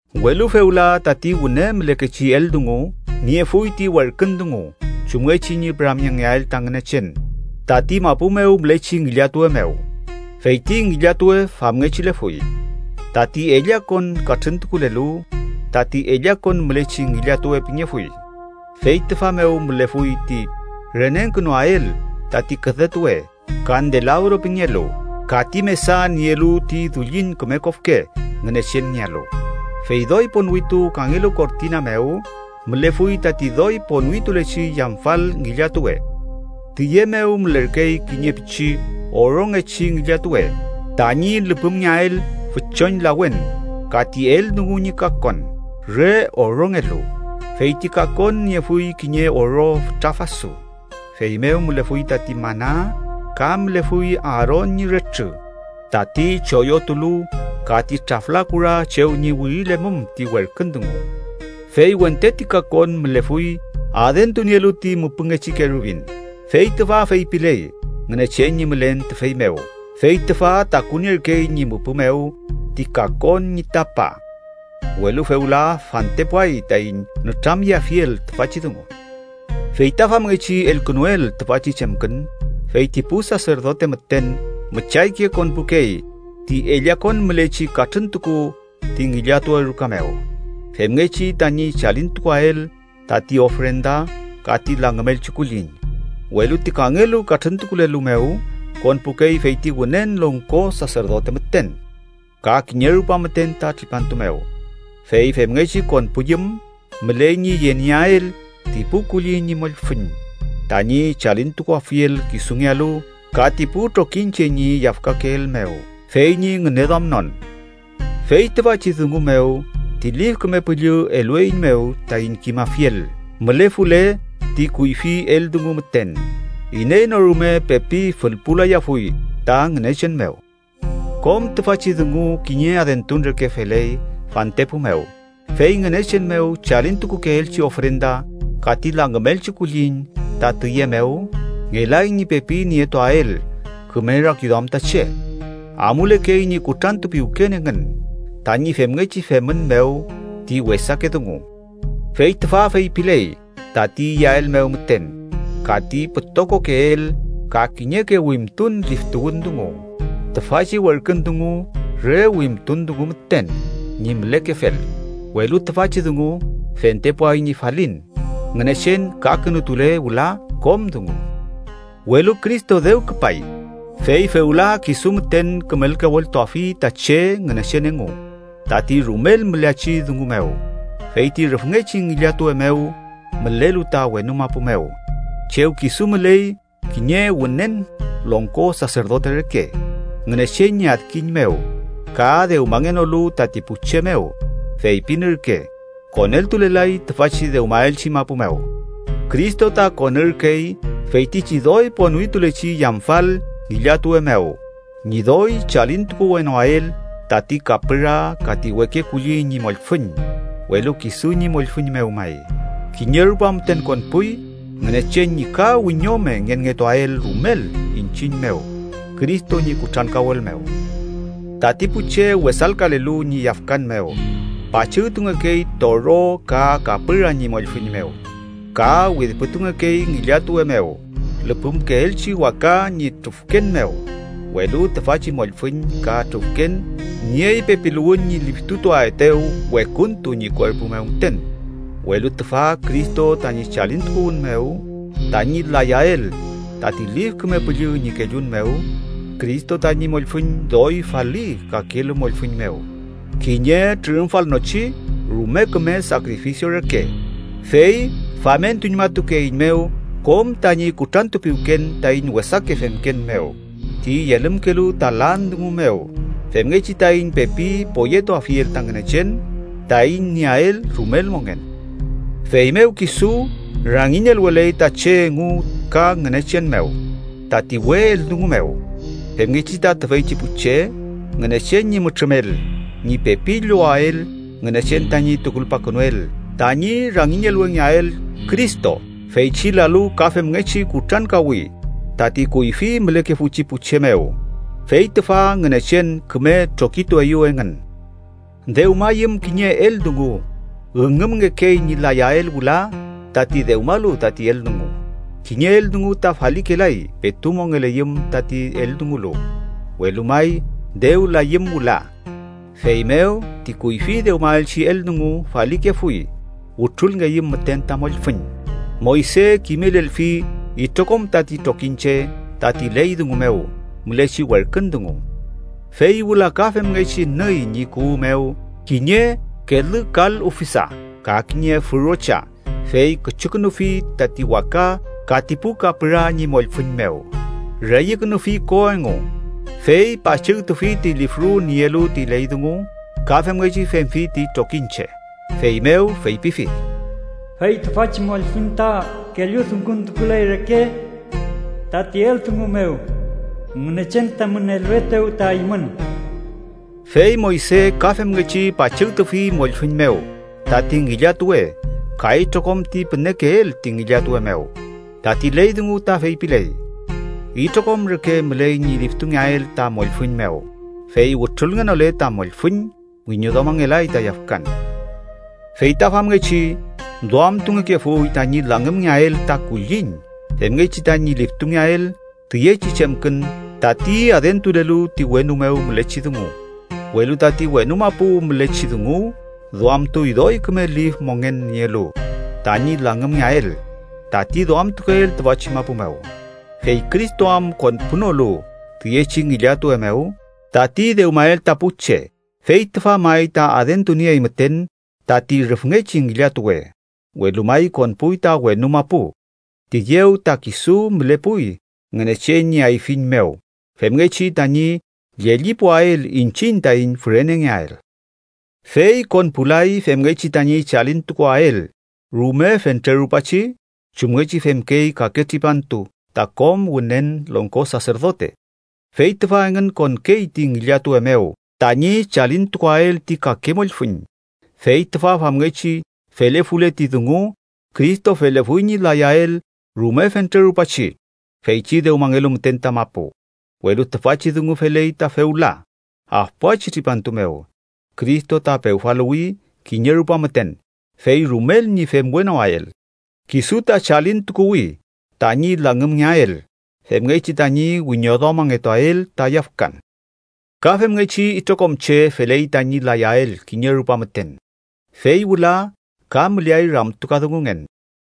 Welu fewla, tati wüne mülekechi eldungu niefuy ti werkün dungu chumngechi ñi püramyengeael ta Ngünechen tati mapu mew mülechi ngillatuwe mew. Fey ti ngillatuwe famngechilefuy: tati ellakon katrüntukulelu, tati ellakon mülechi ngillatuwe pingefuy, fey tüfa mew mülefuy ti renengkünuael tati küdetuwe kandelabro pingelu ka ti mesa nielu ti dullin küme kofke Ngünechenngealu. Fey doy ponwitu kangelu kortina mew mülefuy tati doy ponwitulechi yamfal ngillatuwe. Tüye mew mülerkey kiñe pichi orongechi ngillatuwe tañi lüpümngeael füchon lawen ka ti eldungu ñi kakon, re orongelu. Fey ti kakon niefuy kiñe oro fütra fasu. Feymew mülefuy tati mana ka mülefuy Aaron ñi retrü, tati choyotulu, ka ti trafla kura chew ñi wirilemum ti werkün dungu. Fey wente ti kakon mülefuy adentunielu ti müpüngechi kerubin, fey tüfa feypiley Ngünechen ñi mülen tüfey mew, fey tüfa takunierkey ñi müpü mew ti kakon ñi tapa. Welu fewla fantepuay taiñ nütramyeafiel tüfachi dungu. Fey ta famngechi elkünuel tüfachi chemkün, fey ti pu saserdote müten müchayke konpukey ti ellakon mülechi katrüntuku ti ngillatuwe ruka mew femngechi tañi chalintukuael tati ofrenda ka ti langümelchi kulliñ, welu ti kangelu katrüntukulelu mew konpukey feyti Wünen Longko Saserdote müten, ka kiñe rupa müten ta tripantu mew. Fey femngechi konpuyüm, müley ñi yenieael ti pu kulliñ ñi mollfüñ tañi chalintukuafiel kisungealu ka ti pu trokiñche ñi yafkakeel mew fey ñi ngüneduamnon. Fey tüfachi dungu mew ti Lif Küme Püllü elueiñmew taiñ kimafiel mülefule ti kuyfi eldungu müten, iney no rume pepi fülpulayafuy ta Ngünechen mew. Kom tüfachi dungu kiñe adentun reke feley fantepu mew. Fey Ngünechen mew chalintukukeelchi ofrenda ka ti langümelchi kulliñ ta tüye mew ngelay ñi pepi nietuael küme rakiduam ta che. Amulekey ñi kutrantupiwken engün tañi femngechi femün mew ti wesake dungu. Fey tüfa feypiley tati iyael mew müten, ka ti pütokokeel ka kiñeke wimtun liftuwün dungu. Tüfachi werkün dungu re wimtun dungu müten ñi mülekefel, welu tüfachi dungu fentepuay ñi falin, Ngünechen kakünutule wüla kom dungu. Welu Cristo dew küpay, fey fewla kisu müten kümelkaweltuafi ta che Ngünechen engu tati rumel müleachi dungu mew, fey ti rüfngechi ngillatuwe mew mülelu ta wenu mapu mew chew kisu müley kiñe Wünen Longko Saserdote reke, Ngünechen ñi adkiñ mew, ka dewmangenolu tati pu che mew, feypin ürke, koneltulelay tüfachi dewmaelchi mapu mew. Cristo ta konürkey feytichi doy ponwitulechi yamfal ngillatuwe mew ñi doy chalintukuwenoael tati kapüra ka ti weke kulliñ ñi mollfüñ, welu kisu ñi mollfüñ mew may. Kiñe rupa müten konpuy, Ngünechen ñi ka wiñome ngenngetuael rumel iñchiñ mew Cristo ñi kutrankawel mew. Tati pu che wesalkalelu ñi yafkan mew pachügtungekey toro ka kapüra ñi mollfüñ mew ka widpütungekey ngillatuwe mew lüpümkeelchi waka ñi trufken mew. Welu tüfachi mollfüñ ka trufken niey pepiluwün ñi liftutuaetew wekuntu ñi kuerpu mew müten. Welu tüfa Cristo tañi chalintukuwün mew tañi layael tati Lif Küme Püllü ñi kellun mew, Cristo tañi mollfüñ doy faliy kakelu mollfüñ mew, kiñe trürümfalnochi rume küme sakrifisio reke. Fey famentuñmatukeeiñmew kom tañi kutranpiwken taiñ wesake femken mew ti yelümkelu ta lan dungu mew, femngechi taiñ pepi poyetuafiel ta Ngünechen taiñ nieael rumel mongen. Feymew kisu rangiñelweley ta che engu ka Ngünechen mew tati we eldungu mew, femngechi ta tüfeychi pu che Ngünechen ñi mütrümel ñi pepi llowael Ngünechen tañi tukulpakünuel tañi rumelngeael Cristo feychi lalu ka femngechi kutrankawi tati kuyfi mülekefuchi pu che mew, fey tüfa Ngünechen küme trokitueyew engün. Dewmayüm kiñe eldungu, üngümngekey ñi layael wüla tati dewmalu tati eldungu. Kiñe eldungu ta falikelay petu mongeleyüm tati eldungulu, welu may dew layüm wüla. Feymew, ti kuyfi dewmaelchi eldungu falikefuy, wütrulngeyüm müten ta mollfüñ. Moyse kimelelfi itrokom tati trokiñche tati ley dungu mew mülechi werkün dungu. Fey wüla ka femngechi nüy ñi kuwü mew kiñe kelü kal ufisa ka kiñe fürocha, fey küchukünufi tati waka ka ti pu kapüra ñi mollfüñ mew. Reyükünufi ko engu, fey pachügtufi ti lifru nielu ti ley dungu ka femngechi femfi ti trokiñche. Feymew feypifi: “Fey tüfachi mollfüñ ta kelludunguntukuley reke tati eldungu mew Ngünechen tamün eluetew ta eymün.” Fey Moyse ka femngechi pachügtufi mollfüñ mew tati ngillatuwe ka itrokom ti pünekeel ti ngillatuwe mew. Tati ley dungu ta feypiley, itrokom reke müley ñi liftungeael ta mollfüñ mew. Fey wütrulngenole ta mollfüñ, wiñoduamangelay ta yafkan. Fey ta famngechi duamtungekefuy tañi langümngeael ta kulliñ femngechi tañi liftungeael tüyechi chemkün tati adentulelu ti wenu mew mülechi dungu, welu tati wenu mapu mülechi dungu duamtuy doy küme lif mongen nielu tañi langümngeael tati duamtukeel tüfachi mapu mew. Fey Cristo am konpunolu tüyechi ngillatuwe mew tati dewmael ta pu che, fey tüfa may ta adentuniey müten tati rüfngechi ngillatuwe, welu may konpuy ta wenu mapu. Tüyew ta kisu mülepuy Ngünechen ñi ayfiñ mew femngechi tañi llellipuael iñchiñ taiñ fürenengeael. Fey konpulay femngechi tañi chalintukuwael rume fentre rupachi, chumngechi femkey kake tripantu ta kom Wünen Longko Saserdote, fey tüfa engün konkey ti ngillatuwe mew tañi chalintukuael ti kake mollfüñ. Fey tüfa famngechi felefule ti dungu, Cristo felefuy ñi layael rume fentre rupachi feychi dewmangelu müten ta mapu. Welu tüfachi dungu feley ta fewla, afpuachi tripantu mew Cristo ta pewfaluwi kiñe rupa müten, fey rumel ñi femwenoael. Kisu ta chalintukuwi tañi langümngeael femngechi tañi wiñoduamangetuael ta yafkan. Ka femngechi itrokom che feley tañi layael kiñe rupa müten, fey wüla ka müleay ramtukadungungen.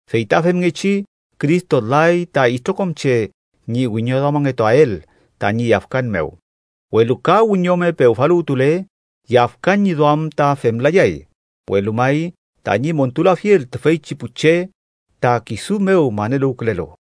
Fey ta femngechi Cristo lay ta itrokom che ñi wiñoduamangetuael tañi yafkan mew. Welu ka wiñome pewfaluwtule, yafkan ñi duam ta femlayay, welu may tañi montulafiel tüfeychi pu che ta kisu mew maneluwkülelu.